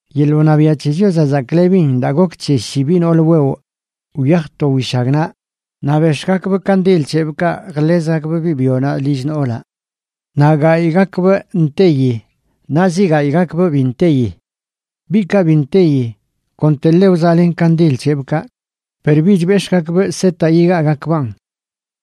’Yeḻꞌ wṉabiaꞌ c̱he Chiozaꞌ chzaklebin daa gok c̱he shi biꞌ nool wewꞌ wyaj to wishagnaꞌ, naꞌ bex̱ꞌgakbꞌ kandil c̱hebꞌkaꞌ jḻezgakbꞌ biꞌ byonaꞌ lill noolaꞌ. Naꞌ gayꞌgakbꞌ nteyi naꞌ zi gayꞌgakbꞌ bi nteyi. Biꞌkaꞌ bi nteyi konteḻe wzaꞌlen kandil c̱hebꞌkaꞌ, per bich bex̱ꞌgakbꞌ setaꞌ yigaagakbaꞌn.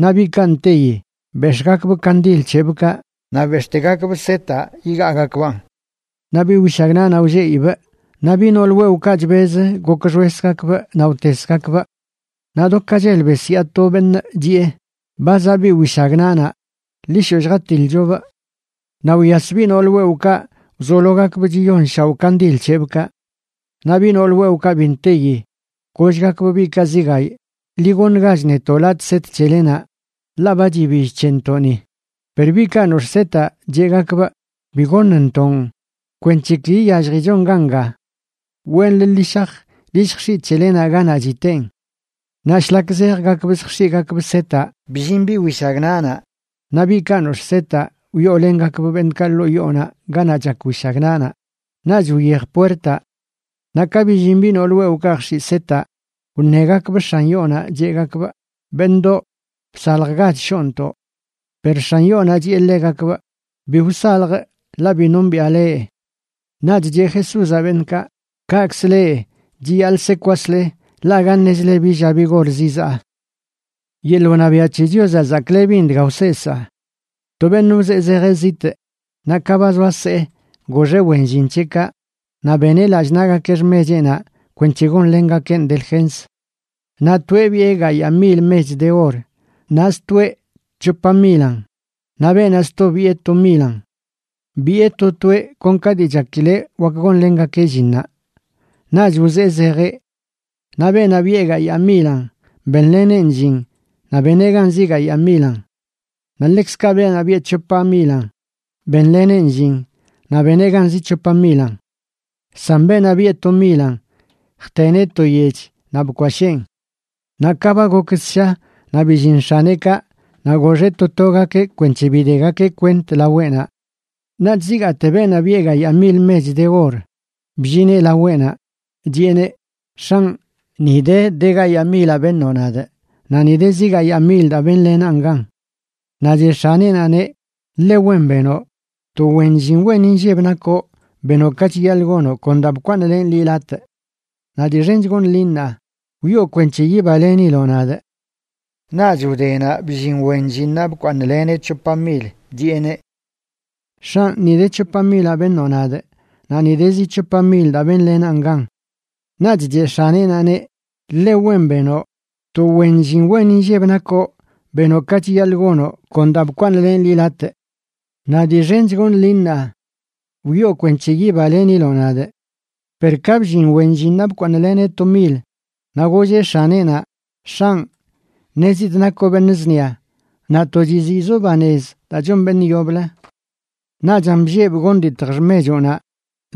Naꞌ biꞌkaꞌ nteyi, bex̱ꞌgakbꞌ kandil c̱hebꞌkaꞌ naꞌ bex̱ꞌtegakbꞌ setaꞌ yigaagakbaꞌn. Naꞌ biꞌ wishagnaꞌnaꞌ wlleꞌibꞌ naꞌ biꞌ nool wewꞌkaꞌ chbez gokxwesgakbꞌ naꞌ wtesgakbꞌ. Naꞌ do ka chel besyaa to beṉꞌ, chiꞌe: “¡Ba zaꞌ biꞌ wishagnaꞌnaꞌ, ḻi shoꞌ lljatilchobꞌ!” Naꞌ wyas biꞌ nool wewꞌkaꞌ wzologakbꞌ chiyonshaoꞌ kandil c̱hebꞌkaꞌ. Naꞌ biꞌ nool wewꞌkaꞌ bi nteyi gollgakbꞌ biꞌkaꞌ zi gayꞌ: “Ḻi goṉgach netoꞌ latꞌ set c̱helenaꞌ ḻaꞌ ba chibill c̱hentoꞌni.” Per biꞌkaꞌ nox̱ꞌ setaꞌ cheꞌgakbꞌ: “Bi goṉntoꞌn, kwenc̱he ki iyalljichon ganga. Wenlə ḻi shaj ḻi lljx̱iꞌ c̱helenaꞌ ganaꞌ chiteen.” Naꞌ shlak zejgakbꞌ zjx̱iꞌgakbꞌ setaꞌ, bllin biꞌ wishagnaꞌnaꞌ naꞌ biꞌkaꞌ nox̱ꞌ setaꞌ wyoolengakbꞌ beṉꞌkaꞌ ḻoo yoonaꞌ ganaꞌ chak wishagnaꞌnaꞌ, naꞌch wyej puertaꞌ. Naꞌ ka billin biꞌ nool wewꞌkaꞌ jx̱iꞌ setaꞌ, wṉegakbꞌ x̱an yoonaꞌ cheꞌgakbꞌ: “¡Beṉꞌdoꞌ, bsaljgach shoontoꞌ!” Per x̱an yoonaꞌ chiꞌe ḻegakbꞌ: “Bi wsaljꞌ, ḻaꞌ bi nombiꞌa leꞌ.” Naꞌch cheꞌ Jesúzaꞌ beṉꞌkaꞌ: ―Kaꞌkzə leꞌ, chiyaḻꞌ se kwasle, ḻaꞌ aga ṉezile bi lla bi gor zizaa. ’Yeḻꞌ wṉabiaꞌ c̱he Chiozaꞌ zaklebin dga wseesaa. To beṉꞌ wzee zejeꞌ zitꞌ, naꞌ ka ba zoa see, goxeꞌ wen llin c̱heꞌkaꞌ naꞌ beneꞌ lallꞌ naꞌgakeꞌ xmecheꞌnaꞌ kwenc̱he gonlengakeꞌn delgens. ’Naꞌ toeꞌ biꞌe gayaa mil mech de or, naꞌ stoeꞌ c̱hopa milan, naꞌ beenaꞌ sto biꞌe to milan. Biꞌe to toeꞌ kon ka dii chakileꞌ wak gonlengakeꞌ llinnaꞌ. Naꞌch wzee zejeꞌ. Naꞌ beenaꞌ biꞌe gayaa milan, benleneꞌn llin naꞌ beneꞌ gan zi gayaa milan. Naꞌ ḻekzkaꞌ beenaꞌ biꞌe c̱hopa milan, benleneꞌn llin naꞌ beneꞌ gan zi c̱hopa milan. San beenaꞌ biꞌe to milan, jteneꞌ to yech naꞌ bkwasheen. ’Naꞌ ka ba gok ssha naꞌ billin x̱aneꞌkaꞌ, naꞌ goxeꞌ to togakeꞌ kwenc̱he bidegakeꞌ kwent laweꞌnaꞌ. Naꞌch zigaate beenaꞌ biꞌe gayaa mil mech de or bllineꞌ laweꞌnaꞌ, chiꞌeneꞌ: “X̱anꞌ, ni de de gayaa milaꞌ beṉoꞌ nadꞌ, naꞌ ni de zi gayaa mil daa benlenaꞌn gan.” Naꞌ cheꞌ x̱aneꞌnaꞌneꞌ: “Ḻe wen benoꞌ, to wen llin wen inlleb nakoꞌ, benoꞌ ka chiyaḻꞌ gonoꞌ kon daa bkwaaṉlenꞌ liꞌ latꞌ. Naꞌ dii xench goṉꞌ liꞌ ṉaa. Wyoo kwenc̱he yibaleniloꞌ nadꞌ.” Naꞌch wdenaꞌ bllin wen llinnaꞌ bkwaaṉleneꞌ c̱hopa mil, chiꞌeneꞌ: “X̱anꞌ, ni de de c̱hopa milaꞌ beṉoꞌ nadꞌ, naꞌ ni de zi c̱hopa mil daa benlenaꞌn gan.” Naꞌch cheꞌ x̱aneꞌnaꞌneꞌ: “Ḻe wen benoꞌ, to wen llin inlleb wen nakoꞌ, benoꞌ ka chiyaḻꞌ gonoꞌ kon daa bkwaaṉlenꞌ liꞌ latꞌ. Naꞌ dii xench goṉꞌ liꞌ ṉaa. Wyoo kwenc̱he yibaleniloꞌ nadꞌ.” Per ka bllin wen llinnaꞌ bkwaaṉleneꞌ to mil, naꞌ golleꞌ x̱aneꞌnaꞌ: “X̱anꞌ, ṉezidꞌ nakoꞌ beṉꞌ zṉia, naꞌ to chiziꞌzoꞌ banez daa chon beṉꞌ yoblə. Naꞌchan bllebꞌ gonditjꞌ xmechoꞌnaꞌ,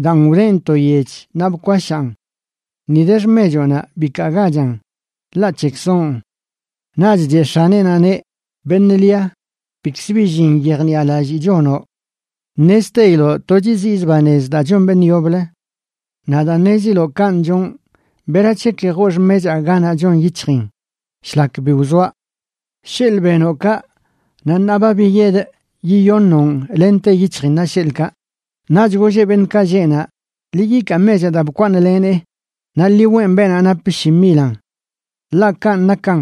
daan wdenꞌ to yech naꞌ bkwashaan. Ni de xmechoꞌnaꞌ, bikaagachan, ḻaꞌ c̱hekzoꞌn.” Naꞌch cheꞌ x̱aneꞌnaꞌneꞌ: “Beṉꞌ lia, bikz bi llin yejniꞌalallii chonoꞌ. Ṉezteiloꞌ to chiziꞌzꞌ banez daa chon beṉꞌ yoblə. Naꞌ daa ṉeziloꞌ kanꞌ chonꞌ, ¿berac̱he ki joo xmechaa ganaꞌ chon yic̱hjin shlak bi wzoaꞌ? Sheḻꞌ benoꞌ kaꞌ, naꞌ ṉaa ba biyedꞌ yiyoṉoꞌn lente yic̱hjinnaꞌ, sheḻꞌkaꞌ.” Naꞌch golleꞌ beṉꞌkaꞌ lleꞌ naꞌ: “Ḻi yikaa mechaꞌ daa bkwaaṉleneꞌ naꞌ ḻi weꞌn beenaꞌ nap shi milan. Ḻaꞌ kanꞌ nakan,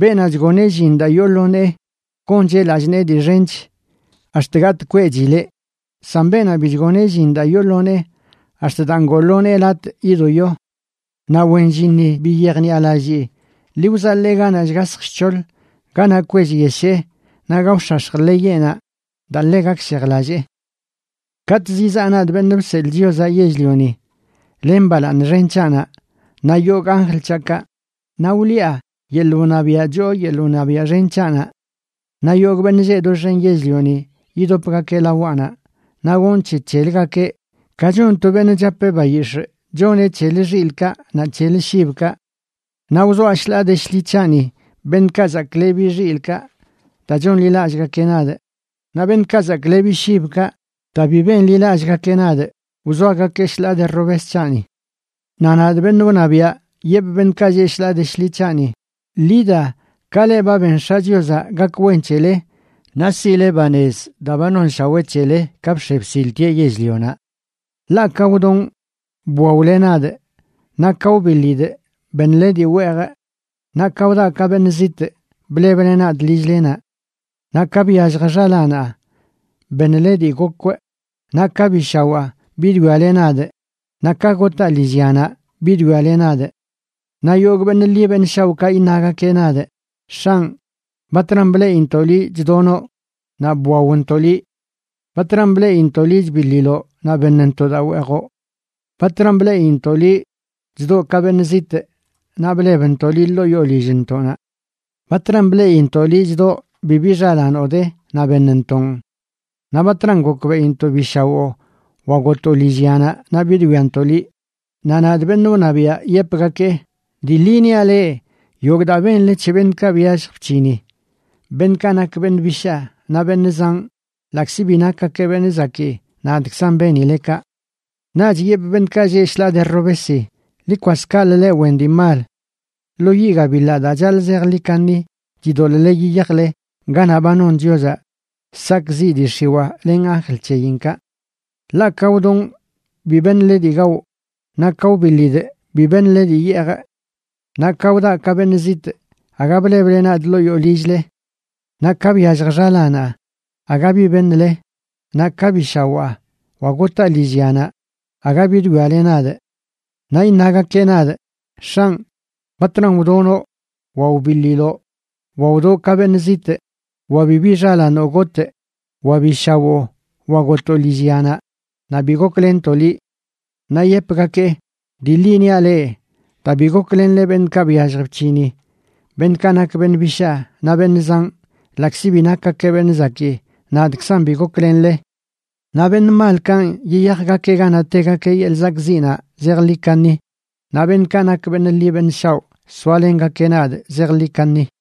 beenaꞌ chgoneꞌ llin daa yoo lo nee, goncheꞌ lallꞌ nee dii xench ax̱t gatꞌ kweꞌchileꞌ; san beenaꞌ bi chgoneꞌ llin daa yoo lo nee, ax̱t daa ngoo lo nee latꞌ yidoyo. Naꞌ wen llinni bi yejniꞌalallii, ḻi wzaḻee ganaꞌ shgasj shc̱hoḻ, ganaꞌ kwellyeshee naꞌ gaox̱ax̱j ḻeyeꞌnaꞌ daa ḻe gakshejlallee.” ’Katꞌ zizaꞌ nadꞌ, Beṉꞌ Bseḻꞌ Chiozaꞌ Yell-lioni, len balaaṉ xen c̱haꞌnaꞌ naꞌ yogꞌ anjl c̱haꞌkaꞌ, naꞌ wliꞌa yeḻꞌ wṉabiaꞌ choo yeḻꞌ wṉabiaꞌ xen c̱haꞌnaꞌ. Naꞌ yogꞌ beṉꞌ lleꞌ doxen yell-lioni yidopgakeꞌ lawaꞌnaꞌ, naꞌ gonꞌ c̱he c̱heləgakeꞌ ka chon to beṉꞌ chapeꞌ bayix̱ꞌ choneꞌ c̱helə xilꞌkaꞌ naꞌ c̱helə shibkaꞌ. Naꞌ wzoaꞌ shḻaa de shḻi c̱haꞌni beṉꞌkaꞌ zaklebi xilꞌkaꞌ daa chonḻilallꞌgakeꞌ nadꞌ, naꞌ beṉꞌkaꞌ zaklebi shibkaꞌ daa bi benḻilallꞌgakeꞌ nadꞌ, wzoagakee shḻaa de robes c̱haꞌni. Naꞌ nadꞌ, beṉꞌ wṉabiaꞌ, yepꞌ beṉꞌkaꞌ lleꞌ shḻaa de shḻi c̱haꞌni: “Ḻi da, ka leꞌ ba ben X̱aꞌ Chiozaꞌ ka gak wen c̱hele, naꞌ siꞌle banez daa ba nonshawee c̱hele ka bx̱e bsiltieꞌ yell-lionaꞌ. Ḻaꞌ ka wdonꞌ, bwaole nadꞌ; naꞌ ka wbiḻidꞌ, beṉle dii weejꞌ; naꞌ ka wdaꞌ ka beṉꞌ zitꞌ, bleble nadꞌ lill-lenaꞌ. Naꞌ ka byallj xalaanaꞌ, beṉle dii gokwꞌ, naꞌ ka bi shawaa, bidwiale nadꞌ; naꞌ ka gotaa lillyanaꞌ, bidwiale nadꞌ.” Naꞌ yogꞌ beṉꞌ ḻi beṉꞌ shaoꞌkaꞌ iṉagakeꞌ nadꞌ: “X̱anꞌ, ¿batran bleꞌintoꞌ liꞌ chdonoꞌ naꞌ bwaontoꞌ liꞌ? ¿Batran bleꞌintoꞌ liꞌ chbiḻiloꞌ naꞌ beṉntoꞌ daa weejoꞌ? ¿Batran bleꞌintoꞌ liꞌ chdoꞌ ka beṉꞌ zitꞌ naꞌ blebntoꞌ liꞌ ḻoo yoo lillntoꞌnaꞌ? ¿Batran bleꞌintoꞌ liꞌ chdoꞌ bibi xalaanoꞌ de naꞌ beṉntoꞌn? Naꞌ ¿batran gokbeꞌintoꞌ bi shawoo wa gotoo lillyanaꞌ naꞌ bidwiantoꞌ liꞌ?” Naꞌ nadꞌ, beṉꞌ wṉabiaꞌ, yepgakee: “Dii ḻi niaꞌ leꞌ, yogꞌ daa benle c̱he beṉꞌkaꞌ byallj bc̱hini, beṉꞌkaꞌ nak beṉꞌ bishaa naꞌ beṉꞌ zanꞌ, ḻaꞌkzi bi nakgakeꞌ beṉꞌ zakii, nadꞌkzan benile kaꞌ.” ’Naꞌch yepꞌ beṉꞌkaꞌ lleꞌ shḻaa de robesi: “Ḻi kwas kaꞌlə, leꞌ wen dii mal. Lo yiꞌ gabiḻaꞌ daa chaḻꞌ zejḻi kaṉi chidoḻꞌle yiyajle ganaꞌ ba non Chiozaꞌ sakꞌziꞌ dii x̱iwaa len anjl c̱heyinkaꞌ. Ḻaꞌ ka wdonꞌ bi beṉle dii gawꞌ; naꞌ ka wbiḻidꞌ bi beṉle dii yeejꞌ. Naꞌ ka wdaꞌ ka beṉꞌ zitꞌ, aga bleble nadꞌ ḻoo yoo lill-le. Naꞌ ka byallj xalaanaꞌ, aga bi beṉle; naꞌ ka bi shawaa wa gotaa lillyanaꞌ, aga bidwiale nadꞌ.” Naꞌ iṉagakeꞌ nadꞌ: “X̱anꞌ, ¿batran wdonoꞌ, wa wbiḻiloꞌ, wa wdoo ka beṉꞌ zitꞌ, wa bibi xalaanoꞌ gotꞌ, wa bi shawoo, wa gotoo lillyanaꞌ naꞌ bi goklenntoꞌ liꞌ?” Naꞌ yepgakee: “Dii ḻi niaꞌ leꞌ, daa bi goklenle beṉꞌkaꞌ byallj bc̱hini, beṉꞌkaꞌ nak beṉꞌ bishaa naꞌ beṉꞌ zanꞌ, ḻaꞌkzi bi nakgakeꞌ beṉꞌ zakii, nadꞌkzan bi goklenle.” Naꞌ beṉꞌ malkanꞌ yiyajgakeꞌ ganaꞌ tegakeꞌ yeḻꞌ sakꞌziꞌnaꞌ zejḻi kaṉi, naꞌ beṉꞌkaꞌ nak beṉꞌ ḻi beṉꞌ shaoꞌ soalengakeꞌ nadꞌ zejḻi kaṉi.